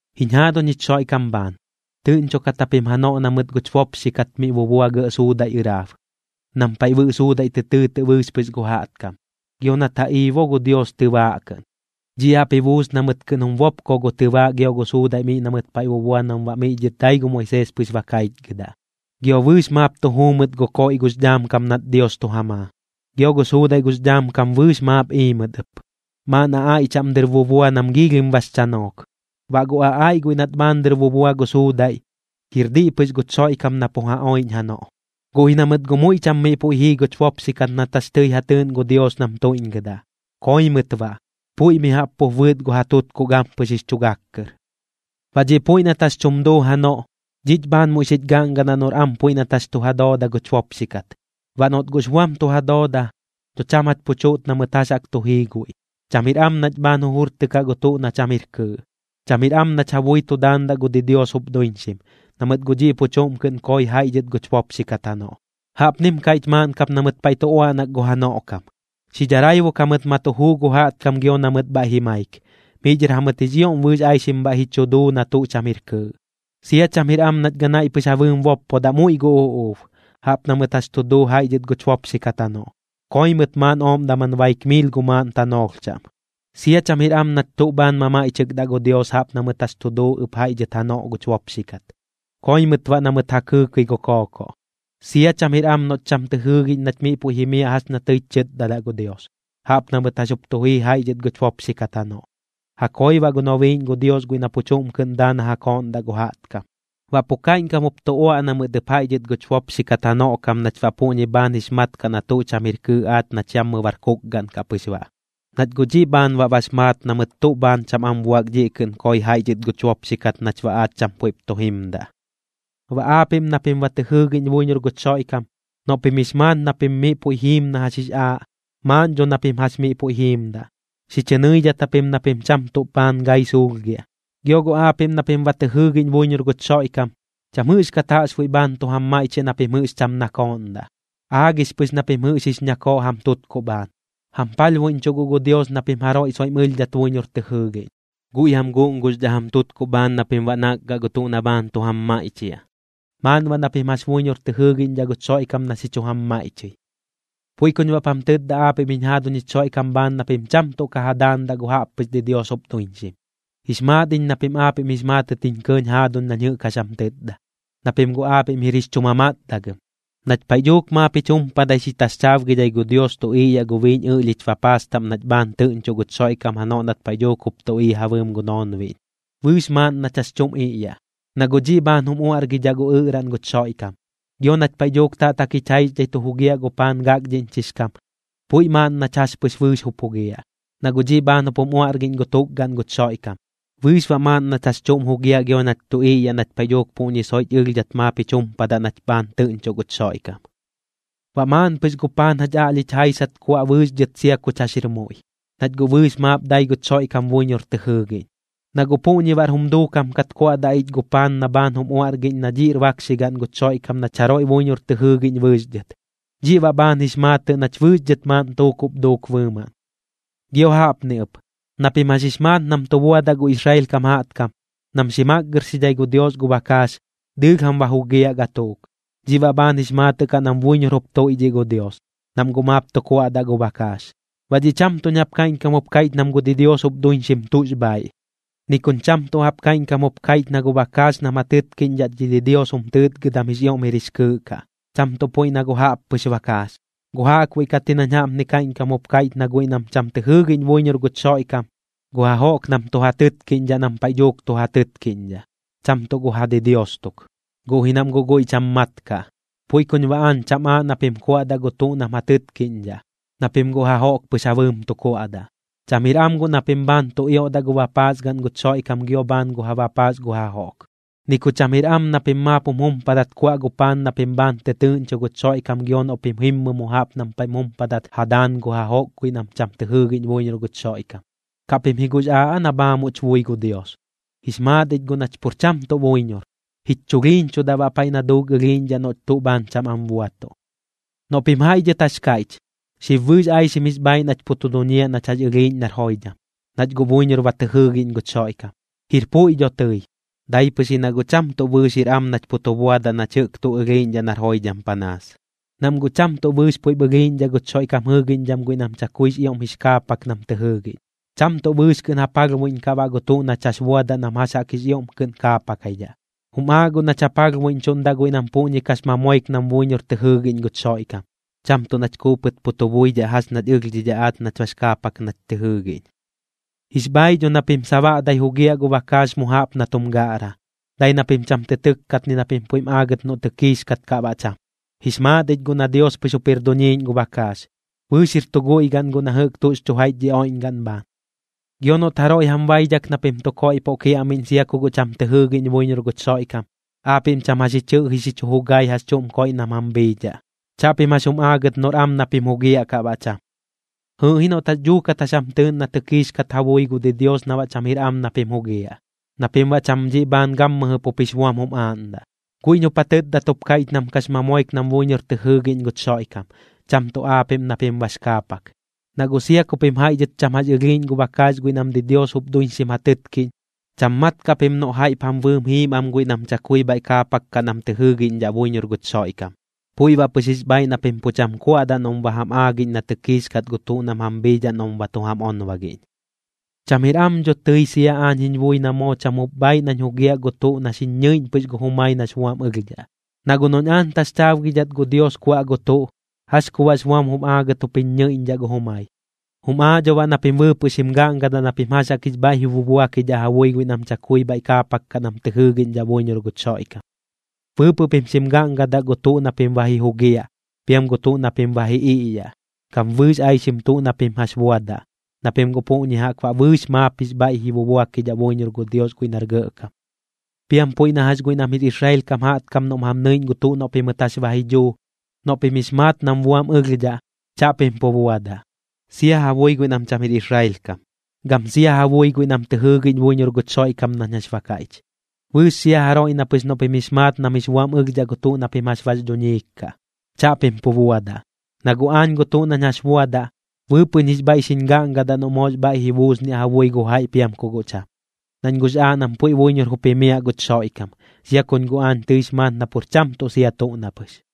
Jiñ jaaduñ jich Xoiꞌkam bhaan, tɨꞌñchokat japim janoꞌ na mɨt guch bopxi kat miꞌ bubua gɇꞌ suudaiꞌ ɨraab, nam paiꞌ Bɨꞌ Suudaiꞌ tɨ tɨɨtɨꞌ bɨɨx pɨx gu jaꞌtkam, gio nat ja ii bo gu Dios tɨbaaꞌ kɨꞌn. Dhiꞌ jaꞌp ji buus na mɨt kɨꞌn jum bopko gu tɨbaaꞌ gio gu suudaiꞌ miꞌ na mɨt paiꞌ bubua nam baꞌ miꞌ dhɨr dai gu Moisees pɨx ba kaichgɨdaꞌ. Gio bɨɨx maap tu juu mɨt gu koiꞌ gux dhaam kam nat Dios tu ja maa. Gio gu suudaiꞌ gux dhaam kam bɨɨx maap ii mɨt ɨp, maaꞌn aꞌaiꞌ chaꞌm dɨr bubua nam giilhim bax chanook. Baꞌ gu aꞌaiꞌ guiꞌ nat bhaan dɨr bubua gu suudaiꞌ, jir diꞌ pɨx guch Xoiꞌkam na pu ja oiꞌñ janoꞌ. Guꞌ ji na mɨt guꞌ muiꞌ cham miꞌ puiꞌ jii guch bopxi kat nat jax tɨi ja tɨɨꞌn gu Dios nam tuiꞌñgɨdaꞌ, koi mɨt baꞌ, puiꞌ mi jaꞌp pup bɨɨt gu ja tutkuꞌ gampɨx jix chu gak kɨr. Baꞌ dhiꞌ puiꞌ nat jax chum duu janoꞌ, dhiꞌch bhaan muiꞌ xich gaꞌngadaꞌ noꞌr am puiꞌ nat jax tu ja dooda guch bopxi kat. Baꞌ noꞌt guꞌx buam tu ja dooda, dho cham jach pu chuꞌt na mɨt jax jaꞌk tu jii guiꞌ, cham jir am nach bhaan jujurtɨkaꞌ gu tuꞌ na cham jir kɨɨꞌ. Cham jir am nach ja bui tu daandaꞌ gu didios jup duiñxim, na mɨt guꞌ dhiꞌ pu chuꞌm kɨꞌn koi jaiꞌ dhɨt guch bopxi kat janoꞌ. Jaꞌpnim kaiꞌch maaꞌn kap na mɨt paiꞌ tu uaꞌnak gu janoꞌ kam: “Xi dharaibuk jamɨt ma tu juu gu jaꞌtkam gio na mɨt bhaiꞌ ji maik, miꞌ dhɨr jamɨt jix ioꞌm bɨɨx aixim bhaiꞌ ji chu duu na tuꞌ cham jir kɨɨꞌ.” Sia cham jir am nach ganaiꞌ pɨx ja bɨɨm boppodaꞌ muiꞌ gu uꞌuub, jaꞌp na mɨt jax tu duu jaiꞌ dhɨt guch bopxi kat janoꞌ, koi mɨt maaꞌn ooꞌm daman baik miil gu maaꞌn tanoolh chaꞌm. Sia cham jir am nach tuꞌ bhaan mamaiꞌchɨkdaꞌ gu Dios jaꞌp na mɨt jax tu duu ɨp jaiꞌ dhɨt janoꞌ guch bopxi kat, koi mɨt baꞌ na mɨt ja kɨɨkɨi gu kookoꞌ. Sia cham jir am noꞌch cham tɨ jɨɨgiꞌñ nach miꞌ puiꞌ jimiaꞌ jax ña tɨich chɨtdadaꞌ gu Dios, jaꞌp na mɨt jax jup tu jii jaiꞌ dhɨt guch bopxi kat janoꞌ, ja koi baꞌ gu nobiiꞌñ gu Dios guiꞌ na pu chuꞌm kɨꞌn daa na ja kooꞌndaꞌ gu jaꞌtkam. Baꞌ pu kaiꞌñkam jup tu uaꞌna mɨt ɨp jaiꞌ dhɨt guch bopxi kat janoꞌ kam nach baꞌ puꞌñi bhaan jix mat kaꞌ na tuꞌ cham jir kɨɨꞌ aach nach yammɨ bar kukgaꞌn kaꞌ pɨx baꞌ. Nach guꞌ dhiꞌ bhaan baꞌ bax maat na mɨt tuꞌ bhaan cham am buak dhiꞌ kɨꞌn koi jaiꞌ dhɨt guch bopxi kat nach baꞌ aach cham puiꞌp tu jimdaꞌ. Baꞌ aapiꞌm na pim ba tɨ jɨɨgiꞌñ buiñor guch Xoiꞌkam, noꞌ pim jix maat na pim miꞌ puiꞌ jiim na jax jix aaꞌ, maaꞌn dho na pim jax miꞌ puiꞌ jiimdaꞌ, xi chɨ nɨidhat japim na pim cham tuꞌ bhaan gai suulhgiaꞌ. Gio guꞌ aapiꞌm na pim ba tɨ jɨɨgiꞌñ buiñor guch Xoiꞌkam, cham jɨꞌxkat jaꞌxbuiꞌ bhaan tu jam maiꞌchiaꞌ na pim jɨꞌx cham nakooꞌndaꞌ, aagix pɨx na pim jɨꞌx jix ñakooꞌ jam tutkuꞌ bhaan. Jam palhbuiꞌñchuꞌ guꞌ gu Dios na pim jaroiꞌ soiꞌm ɨlhdhat buiñor tɨ jɨɨgiꞌñ, guiꞌ jam guꞌnguxdhaꞌ jam tutkuꞌ bhaan na pim baꞌ nakgaꞌ gu tuꞌ na bhaan tu jam maiꞌchiaꞌ. Maaꞌn baꞌ na pim jax buiñor tɨ jɨɨgiꞌñdhaꞌ guch Xoiꞌkam na xi chu jam maiꞌchɨi. Puiꞌ kuñ baꞌp jam tɨtda aapiꞌm jiñ jaaduñ jich Xoiꞌkam bhaan na pim cham tuꞌ ka ja daandaꞌ gu jaꞌppɨx didios jup duiñxim. Jix maat iñ na pim aapiꞌm jix maatɨt jiñ kɇɇñ jaaduñ nañ jɨꞌk jax jam tɨtda, na pim guꞌ aapiꞌm jir jix chu mamatdagɨm. Nach paiꞌ dhuuk maap jich jumpadai xi taxchaabgidhai gu Dios tu iꞌyaꞌ gu biiñ ɨꞌlhich bapaas taꞌm nach bhaan tɨꞌñchoꞌ guch Xoiꞌkam janoꞌ nat paiꞌ dhuuk jup tu ii ja bɨɨm gu noonbiꞌñ, bɨɨx maaꞌn nach jax chuꞌm iꞌyaꞌ, na guꞌ dhiꞌ bhaan jum uaꞌrgidhaꞌ gu ɨꞌraꞌn guch Xoiꞌkam. Gio nach paiꞌ dhuuk taꞌtak jich jaixdhai tu jugiaꞌ gu paan gakdhiꞌñchix kam, puiꞌ maaꞌn nach jax pɨx bɨɨx jup jugiaꞌ, na guꞌ dhiꞌ bhaan jup jum uaꞌrgiꞌñ gu tukgaꞌn guch Xoiꞌkam. Bɨɨx baꞌ maaꞌn nach jax chuꞌm jugiaꞌ gio nach tu iꞌyaꞌ nach paiꞌ dhuuk puꞌñi soiꞌch ɨlhdhat maap jich jumpadaꞌ nach bhaan tɨꞌñchoꞌ guch Xoiꞌkam. Baꞌ maaꞌn pɨx gu paan jach aꞌlhich jaisat kuaꞌ bɨɨx dhɨt sia kuch jax jir muiꞌ, nach guꞌ bɨɨx maap dai guch Xoiꞌkam buiñor tɨ jɨɨgiꞌñ. Na guꞌ puꞌñi baꞌr jum duukam kat kuaꞌdaꞌ ich gu paan na bhaan jum uaꞌrgiꞌñ na dhiꞌr bakxigaꞌn guch Xoiꞌkam nach jaroiꞌ buiñor tɨ jɨɨgiꞌñ bɨɨx dhɨt, dhiꞌ baꞌ bhaan jix maatɨꞌ nach bɨɨx dhɨt maaꞌn tuukuꞌp duuk bɨɨmaꞌn. Gio jaꞌpni ɨp, na pim jax jix maat nam tu buadaꞌ gu Israel kam jaꞌtkam, nam xi makgɨrxidhai gu Dios gu bakaax, dɨɨlh jam ba jugiaꞌ gatuuk. Dhiꞌ baꞌ bhaan jix maatɨꞌ kaꞌ nam buiñor jup tuiꞌdhiꞌ gu Dios, nam guꞌ maap tu kuaꞌdaꞌ gu bakaax. Baꞌ dhiꞌ cham tuꞌñ jaꞌp kaiꞌñkam jup kaiꞌch nam gu didios jup duiñxim tuꞌx bhaaiꞌ, ni kuñ cham tuꞌ jaꞌp kaiꞌñkam jup kaiꞌch na gu bakaax nam ja tɨtkiꞌñdhaꞌ dhi didios jum tɨɨtgɨdam jix ioꞌm jir jix kɨɨꞌ kaꞌ, cham tuꞌ puiꞌ na gu jaꞌppɨx bakaax. Guꞌ jaꞌkbuiꞌ kat ji nañ jaꞌpni kaiꞌñkam jup kaiꞌch na guiꞌ nam cham tɨ jɨɨgiꞌñ buiñor guch Xoiꞌkam, gu jajoꞌk nam tu ja tɨtkiꞌñdhaꞌ nam paiꞌ dhuuk tu ja tɨtkiꞌñdhaꞌ, cham tuꞌ gu ja didios tuk, guꞌ ji nam guꞌ guiꞌ cham mat kaꞌ. Puiꞌ kuñ baꞌ aañ cham aaꞌ na pim kuaꞌdaꞌ gu tuꞌ nam ja tɨtkiꞌñdhaꞌ, na pim gu jajoꞌk pɨx ja bɨɨm tu kuaꞌdaꞌ. Cham jir am guꞌ na pim bhaan tu ioꞌdaꞌ gu bapaas gaꞌn guch Xoiꞌkam gio bhaan gu ja bapaas gu jajoꞌk. Ni ku cham jir am na pim maap jum jumpadat kuaꞌ gu paan na pim bhaan tɨtɨɨꞌñcho guch Xoiꞌkam gio noꞌ pim jimmɨ mu jaꞌp nam paiꞌp jum jumpadat ja daan gu jajoꞌk guiꞌ nam cham tɨ jɨɨgiꞌñ buiñor guch Xoiꞌkam. ¿Kaꞌ pim ji guꞌx aaꞌ aa na bhaamuꞌch bui gu Dios? Jix maat ich guꞌ nach pur cham tuꞌ buiñor, jich chulhiiñchudaꞌ baꞌ paiꞌ na duuk ɨlhiiꞌñdhaꞌ noꞌch tuꞌ bhaan cham am buatuꞌ. Noꞌ pim jaiꞌ dhɨt jax kaiꞌch: “Xib bɨɨx aixim jix bhaaiꞌ nach pu tu duñiaꞌ nach jax ɨlhiiꞌñ nar joidham, nach guꞌ buiñor ba tɨ jɨɨgiꞌñ guch Xoiꞌkam.” Jir puiꞌ dho tɨi, dai pɨx ji na guꞌ cham tuꞌ bɨɨx jir am nach pu tu buadaꞌ nach jɨꞌk tuꞌ ɨlhiiꞌñdhaꞌ nar joidham panaas, nam guꞌ cham tuꞌ bɨɨx puiꞌp ɨlhiiꞌñdhaꞌ guch Xoiꞌkam jɨɨgiꞌñdham guiꞌ nam chakuix ioꞌm jix kaapak nam tɨ jɨɨgiꞌñ. Cham tuꞌ bɨɨx kɨꞌn ja palhbuiꞌñkaꞌ baꞌ gu tuꞌ nach jax buadaꞌ nam jax jaꞌk jix ioꞌm kɨꞌn kaapakaidhaꞌ. Jum aaꞌ guꞌ nach ja palhbuiꞌñchuꞌndaꞌ guiꞌ nam puꞌñi kax mamoik nam buiñor tɨ jɨɨgiꞌñ guch Xoiꞌkam, cham tuꞌ nach kuupɨt pu tu buidhaꞌ jax ñach ɨlhdhidhaꞌ aach nach bax kaapak nach tɨ jɨɨgiꞌñ. Jix bhaaiꞌ dho na pim sabaꞌdai jugiaꞌ gu bakaax mu jaꞌp na tum gaꞌra, dai na pim cham tɨ tɨkkat ni na pim puiꞌ jim aagɨt noꞌ tɨkiix kaat kaꞌ baꞌ cham. Jix maat ich guꞌ na Dios pɨx jup jir duñiiꞌñ gu bakaax, bɨɨx jir tu guiꞌ gaꞌn guiꞌ na jɨꞌk tuꞌx chu jaiꞌch dhi oiꞌñgaꞌn bhaan. Gio noꞌt jaroiꞌ jam baidhak na pim tu koiꞌpoꞌ kiaꞌmiꞌñ sia ku guꞌ cham tɨ jɨɨgiꞌñ buiñor guch Xoiꞌkam, aapiꞌm cham jax ji chɨꞌji xi chu jugai jax chuꞌm koiꞌ nam jam bhiidhaꞌ, chaꞌpim jax jum aagɨt noꞌr am na pim jugiaꞌ kaꞌ baꞌ cham. Jɨɨꞌ ji noꞌt guꞌ jax dhuukat jax jam tɨɨꞌn na tɨkdhix kat ja bui gu didios na baꞌ cham jir am na pim jugiaꞌ, na pim baꞌ cham dhiꞌ bhaan gammɨjɨ pup jix buam jum aaꞌndaꞌ. Guiꞌñ jup ja tɨtdat jup kaiꞌch nam kax mamoik nam buiñor tɨ jɨɨgiꞌñ guch Xoiꞌkam, cham tuꞌ aapiꞌm na pim bax kaapak. Na guꞌ sia ku pim jaiꞌ dhɨt cham jax ɨlhiiꞌñ gu bakaax guiꞌ nam didios jup duiñxim ja tɨtkiꞌñ, cham mat kaꞌ pim noꞌ jaiꞌp jam bɨɨm jiim am guiꞌ nam chakui bhaiꞌ kaapak kaꞌ nam tɨ jɨɨgiꞌñdhaꞌ buiñor guch Xoiꞌkam. Puiꞌ baꞌ pɨx jix bhaiꞌ na pim pu cham kuaꞌdaꞌ noꞌm ba jam aagiꞌñ na tɨkiix kat gu tuꞌ nam jam bhiidhaꞌ noꞌm ba tu jam onbagiꞌñ. Cham jir am dho tɨi sia aañ jiñ bui na moo cham jup bhaaiꞌ nañ jugiaꞌ gu tuꞌ na xiñ ñɨiꞌñ pɨx gu jumai nax buam ɨlhdhaꞌ. Na guꞌ noꞌñ aañ taxchaabgidhat gu Dios kuaꞌ gu tuꞌ, ¿jax ku baꞌx buam jum aagɨt jup jiñ ñɨiꞌñdhaꞌ gu jumai? Jum aaꞌ dho baꞌ na pim bɨɨpɨꞌ xim gaꞌngadaꞌ na pim jax jaꞌk jix bhaiꞌ ji bubuakidhaꞌ ja bui guiꞌ nam chakui bhaiꞌ kaapak kaꞌ nam tɨ jɨɨgiꞌñdhaꞌ buiñor guch Xoiꞌkam. Bɨɨpɨꞌ pim xim gaꞌngadaꞌ gu tuꞌ na pim ba ji jugiaꞌ, piam gu tuꞌ na pim ba ji iꞌyaꞌ, gam bɨɨx aixim tuꞌ na pim jax buadaꞌ, na pim guꞌ puꞌñi jaꞌk baꞌ bɨɨx maap jix bhaiꞌ ji bubuakidhaꞌ buiñor gu Dios guiꞌ nar Gɇꞌkam. Piam puiꞌ na jax guiꞌ nam jir Israel kam jaꞌtkam noꞌm jam nɨiꞌñ gu tuꞌ noꞌ pimɨt jax ba ji dhuu, noꞌ pim jix maat nam buam ɨlhdhaꞌ, chaꞌpim pu buadaꞌ. Sia ja bui guiꞌ nam cham jir Israel kam, gam sia ja bui guiꞌ nam tɨ jɨɨgiꞌñ buiñor guch Xoiꞌkam nañ jax ba kaiꞌch. Bɨɨx sia jaroiꞌ na pɨx noꞌ pim jix maat nam jix buam ɨlhdhaꞌ gu tuꞌ na pim jax bax dhuñiik kaꞌ, chaꞌpim pu buadaꞌ. Na guꞌ aañ gu tuꞌ nañ jax buadaꞌ, bɨɨpɨꞌñ jix bhaiꞌ xiñ gaꞌngadaꞌ noꞌ moox bhaiꞌ ji buusniaꞌ ja bui gu jaiꞌ piam ku guꞌ cham, nañ guꞌx aaꞌ nam puiꞌ buiñor jup jimiaꞌ guch Xoiꞌkam, sia kuñ guꞌ aañ tɨix maat na pur cham tuꞌ sia tuꞌ na pɨx.